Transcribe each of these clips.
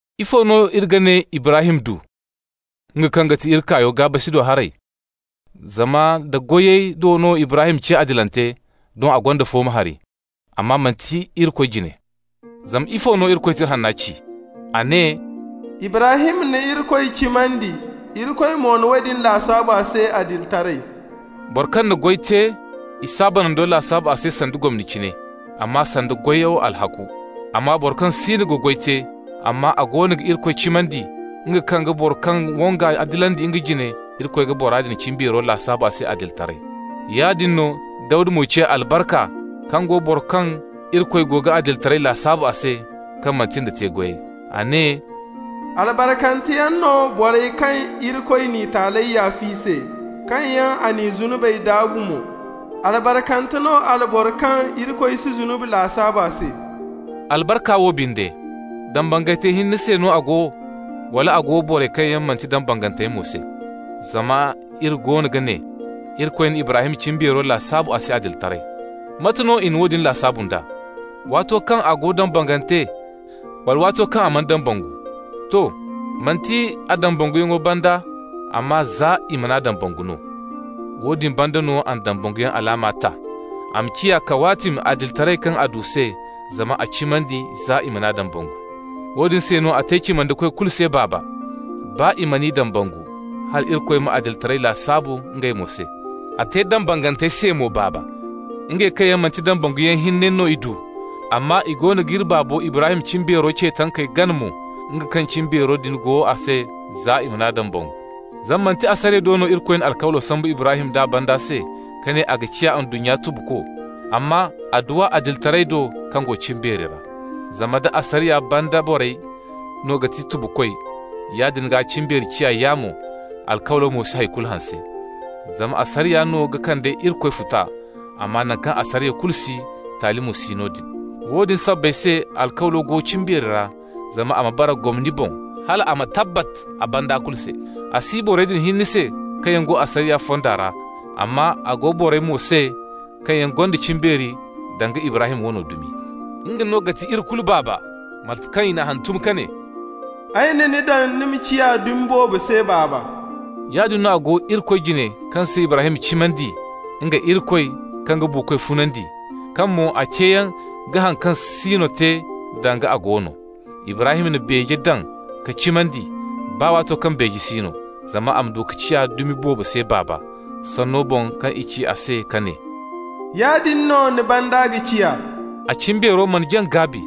Ifo no iri ga ne Ibrahim du, nga kaŋ ga ti iri kaayo, gaa-basi do haray? Zama nda goyey do no Ibrahim ciya adilante, doŋ a gonda fooma hari, amma manti Irikoy jine. Zama ifo no Irikoy Tira Hanna ci? A ne: «Ibrahim na Irikoy cimandi, Irikoy mo na woodin lasaabu a se adilitaray.» Boro kaŋ na goy te, i s'a banando lasaabu a se sanda gomni cine, amma sanda a goyo alhakku. Amma boro kaŋ siino ga goy te, amma a goono ga Irikoy cimandi, nga kaŋ ga boro kaŋ wang'a adilandi nga jine, Irikoy ga bora din cimbeero lasaabu a se adilitaray. Yaadin no Dawda mo ci albarka kaŋ go boro kaŋ Irikoy go ga adilitaray lasaabu a se, kaŋ manti nda te-goyey. A ne: «Albarkanteyaŋ no borey kaŋ Irikoy n'i taaley yaaf'i se, kaŋ yaŋ a n'i zunubey daabu mo. Albarkante no alboro kaŋ Rabbi si zunubi lasaabu a se.» Albarka wo binde, dambangantey hinne se no a go, wala a go borey kaŋ manti dambanganteyaŋ mo se? Zama iri goono ga ne: Irikoy na Ibrahim cimbeero lasaabu a se adilitaray. Mate no i na woodin lasaabu nd'a? Waato kaŋ a go dambangante, wala waato kaŋ a mana dambangu? To. Manti a dambanguyaŋo banda, amma za i man'a dambangu no. Woodin banda no a na dambanguyaŋ alaama ta, a ma ciya kawaatimi adilitaray kaŋ a du se zama a cimandi za i man'a dambangu. Woodin se no a te cimandikoy kulu se baaba, baa i man'i dambangu, hal Irikoy ma adilitaray lasaabu ngey mo se. A te dambangantey se mo baaba, ngey kaŋ yaŋ manti dambanguyaŋ hinne no i du, amma i goono g'iri baabo Ibrahim cimbeero ce tankey gana mo, nga kaŋ cimbeero din go a se za i man'a dambangu. Zama manti asariya do no Irikoy na alkawlo sambu Ibrahim d'a banda se, ka ne a ga ciya ndunnya tubuko, amma a du a adilitaray do kaŋ go cimbeeri ra. Zama nda asariya banda borey no ga ti tubukoy, yaadin gaa cimbeeri ciya yaamo, alkawlo mo si hay kulu hanse. Zama asariya no ga kande Irikoy futa, amma naŋ kaŋ asariya kulu si, taali mo si noodin. Woodin sabbay se alkawlo go cimbeeri ra, zama a ma bara gomni boŋ, hal a ma tabbat a banda kulu se. A si borey din hinne se kaŋ yaŋ go asariya fonda ra, amma a go borey mo se kaŋ yaŋ gonda cimbeeri danga Ibrahim wano dumi. Nga no ga ti iri kulu baaba. (Mate kaŋ i n'a hantum ka ne: «Ay na ni daŋ ni ma ciya dumi boobo se baaba.») Yaadin no a go Irikoy jine kaŋ se Ibrahim cimandi, nga, Irikoy, kaŋ ga buukoy funandi, kaŋ mo a ceeyaŋ ga haŋ kaŋ si no te danga a go no. Ibrahim na beeje daŋ ka cimandi, baa waato kaŋ beeje si no, zama a ma du ka ciya dumi boobo se baaba, sanno boŋ kaŋ i ci a se ka ne: «Yaadin no ni banda ga ciya.» A cimbeero mana jaŋ gaabi,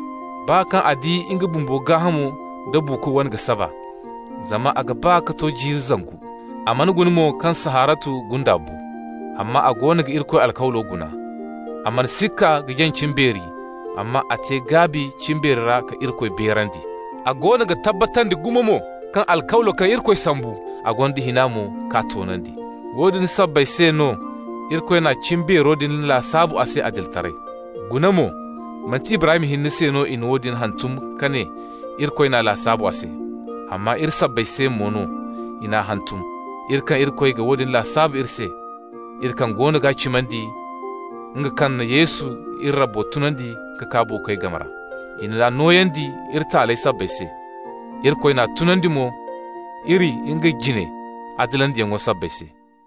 baa kaŋ a di nga bumbo gaahamo da buuko wane ga saba, (zama a ga ba ka to jiiri zangu). A mana guna mo kaŋ Saharatu gunda bu. Amma a goono ga Irikoy alkawlo guna. A mana sikka ka jaŋ cimbeeri, amma a te gaabi cimbeeri ra ka Irikoy beerandi. A goono ga tabbatandi gumo mo kaŋ alkawlo kaŋ Irikoy sambu, a gonda hina mo k'a toonandi. Woodin sabbay se no Irikoy na cimbeero din lasaabu a se adilitaray. Guna mo, manti Ibrahim hinne se no i na woodin hantum ka ne Irikoy n'a lasaabu a se. Amma iri sabbay se mo no i n'a hantum, iri kaŋ Irikoy ga woodin lasaabu iri se, iri kaŋ goono g'a cimandi, nga kaŋ na Yesu iri Rabbo tunandi ka kaa buukoy game ra. I n'a nooyandi iri taaley sabbay se. Irikoy n'a tunandi mo iri nga jine adilandiyaŋo sabbay se.